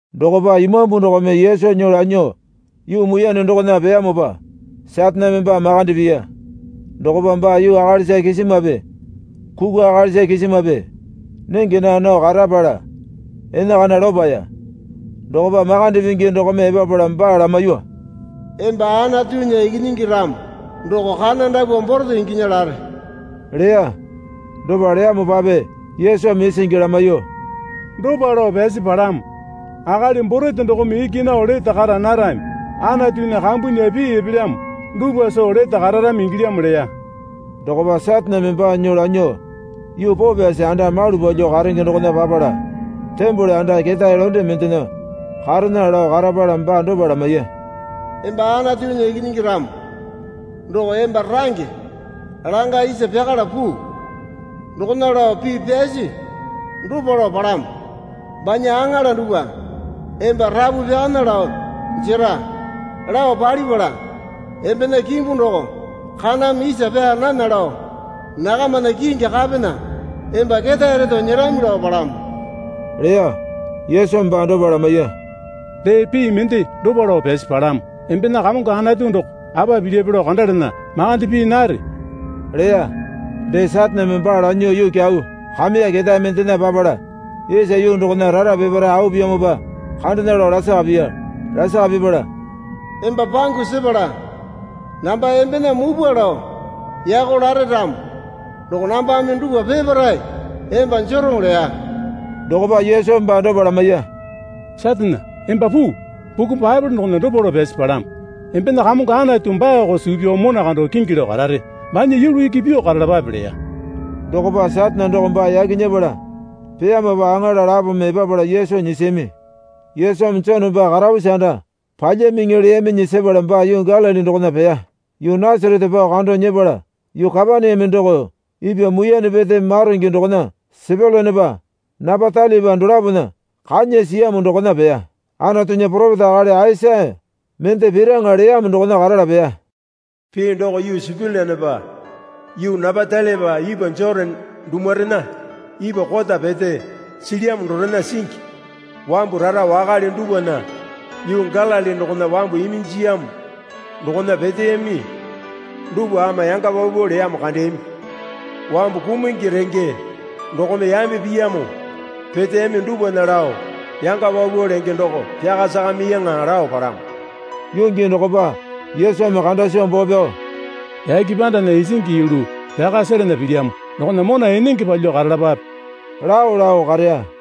Dokopa Imambu dokome Yesu nyuo lanyuo yuu muiyane dokona peyamopa Sataneme baa makande piya. Dokopa baa yuu akalisa kisimape kukwa akalisa kisimape nenge naa nao karapala enakana lopaya. Dokopa Makande Pingi dokome epapala baa lamaiyuo, Emba Anatunya Ikinyingi ramo doko kana dapwa borete inginya lare, leya. Dopa leyamopape Yesumi isingi lamaiyuo, Dopa lao pyasi palamo. Akali borete dokome iki nao lete kara narami. Anatunya kambunya pii epelyamo dupwa soo lete kararami ingilyamo leya. Dokopa Sataneme baa nyuo lanyuo yuu poo pyasi anda malu palyuo karenge dokona papala tembole anda ketae londe mendena karena lao karapala baa dopa lamaiya. Emba Anatunya Ikinyingi ramo doko emba range langa isa pyakala puu. Dokona lao pii pyasi dopa lao palamo, Banya aŋala dupwa emba rapu pyakana lao jera, lao palipala, embena kimbu doko kaname isa pyaa nana lao nakamana kingi kapena emba ketae reto nyerami, lao palamo, leya. Yesumi baa dopa lamaiya, Dee pii mende dopa lao pyasi palamo. Embena Kamongo Anatu doko apa pilyape lao kandalena makande pii nare, leya. Dee Sataneme baa lanyuo yuu kyau kameya ketae mendena papala isa yuu dokona rara peparae au piyamopa kandena lao lasaka piya. Lasaka pipala, Emba pangu sepala namba embena mupwa lao yako lare ramo doko nambame dupwa peparae emba jero, leya. Dokopa Yesumi baa dopa lamaiya, Satane, emba puu. Buku Baepole dokona dopa lao pyasi palamo, Embena Kamongo Anatu baako suu pyao mona kando kingi lao karare. Banya yulu iki pyuo karalapape leya. Dokopa Satane doko baa yaki nyepala peyamopa aŋala lapome epapala Yesu nyisiyami. Yesumi Jone baa karapusi anda palyamiŋi leyaminyi sepala baa yuu Galili dokona peya. Yuu Nasarete pao kando nyepala yuu Kapaneame doko ipwa muiyane pete maronge dokona Sepyulanepa Napatalaipa dolapona kanya siyamo dokona peya. Anatunya poropeta akali Aisaya mende piraŋa leyamo dokona karala peya. Pii doko yuu Sepyulanepa yuu Napatalaipa ipwa Jotane dumurena ipwa kota pete silyamo dorena singi, wambu rara wakale dupwana yuu Galili dokona wambu iminjiyamo dokona peteyami dupwa ama yanga paupau leyamo kandeyami. Wambu kumungi renge dokome yambe piyamo peteyami dupwana lao yanga paupau lenge doko pyaka sakamiyaŋa lao palamo. Yuu gii dokopa Yesumi kanda soo boo pyao, Yake pandana isingi yulu pyaka selena pilyamo dokona mona enenge palyuo karalapape, lao lao kareya.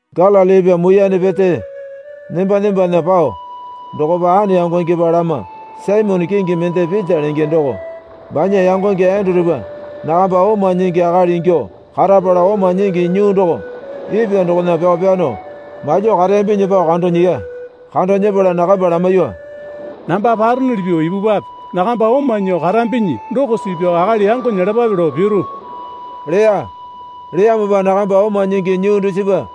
Galili ipwa muiyane pete nemba nembana pao dokopa ane yangonepa lama Saimone kingi mende Pita lenge doko banya yangonge Endurupa nakamba oma nyingi akali ingyuo karapala oma nyingi nyuu doko ipwa dokona pyao pyano malyuo kareyambinyi pao kando nyiya. Kando nyepala nakamba lamaiyuo, Namba paronuli pyuo ipupwape. Nakamba oma nyuo karambinyi doko suu pyao akali yango nyelapape lao piru, leya. Leyamopa nakamba oma nyingi nyuu dusipa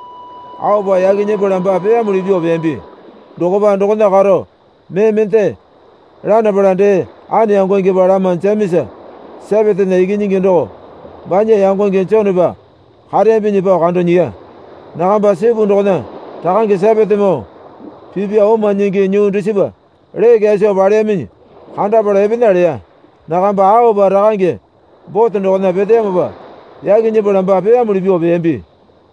aopa yaki nyepala baa peyamuli pyuo peyambi. Dokopa dokona karo mee mende lanapala dee ane yangongepa lama Jemesa Sepetena ikinyingi doko banya yangonge Jonepa kareyambinyi pao kando nyiya. Nakamba sipu dokona rakange Sepetemoo pipya oma nyingi nyuu dusipa lee kyaso paleyaminyi kandapala epena leya. Nakamba aopa rakange bote dokona peteyamopa yaki nyepala baa peyamuli pyuo peyambi.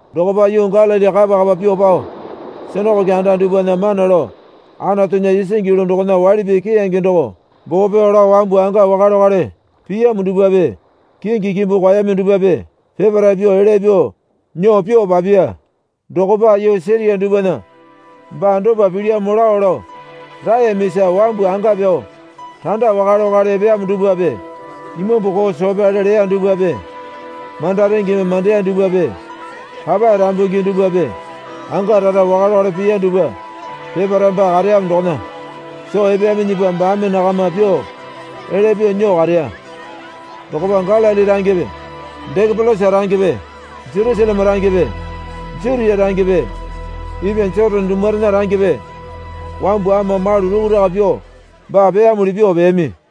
Dokopa yuu Galili kapa kapa pyuo pao sinakoke anda dupwana mana lao Anatunya isingi yulu dokona waili pii keyange doko boo pyao lao wambu anga wakale wakale piyamo dupwape kingi kimbu kwaeyami dupwape peparae pyuo elya pyuo nyuo pyuo papiya. Dokopa yuu Siria dupwana baa dopa pilyamo lao lao raeyamisa wambu anga pyao randa wakale wakale epeyamo dupwape imambu koo soo pyale leya dupwape manda rengeme mandeya dupwape papae rambungi dupwape anga rara wakale wakale piya dupwa peparae baa kareyamo dokona soo epeyaminyipa baame nakama pyuo elya pyuo nyuo kareya. Dokopa Galili rangepe Dekapolisa rangepe Jerusaleme rangepe Jutia rangepe ipwa Jotane dumurena rangepe wambu ama malu rukuraka pyuo baa peyamuli pyuo peyami.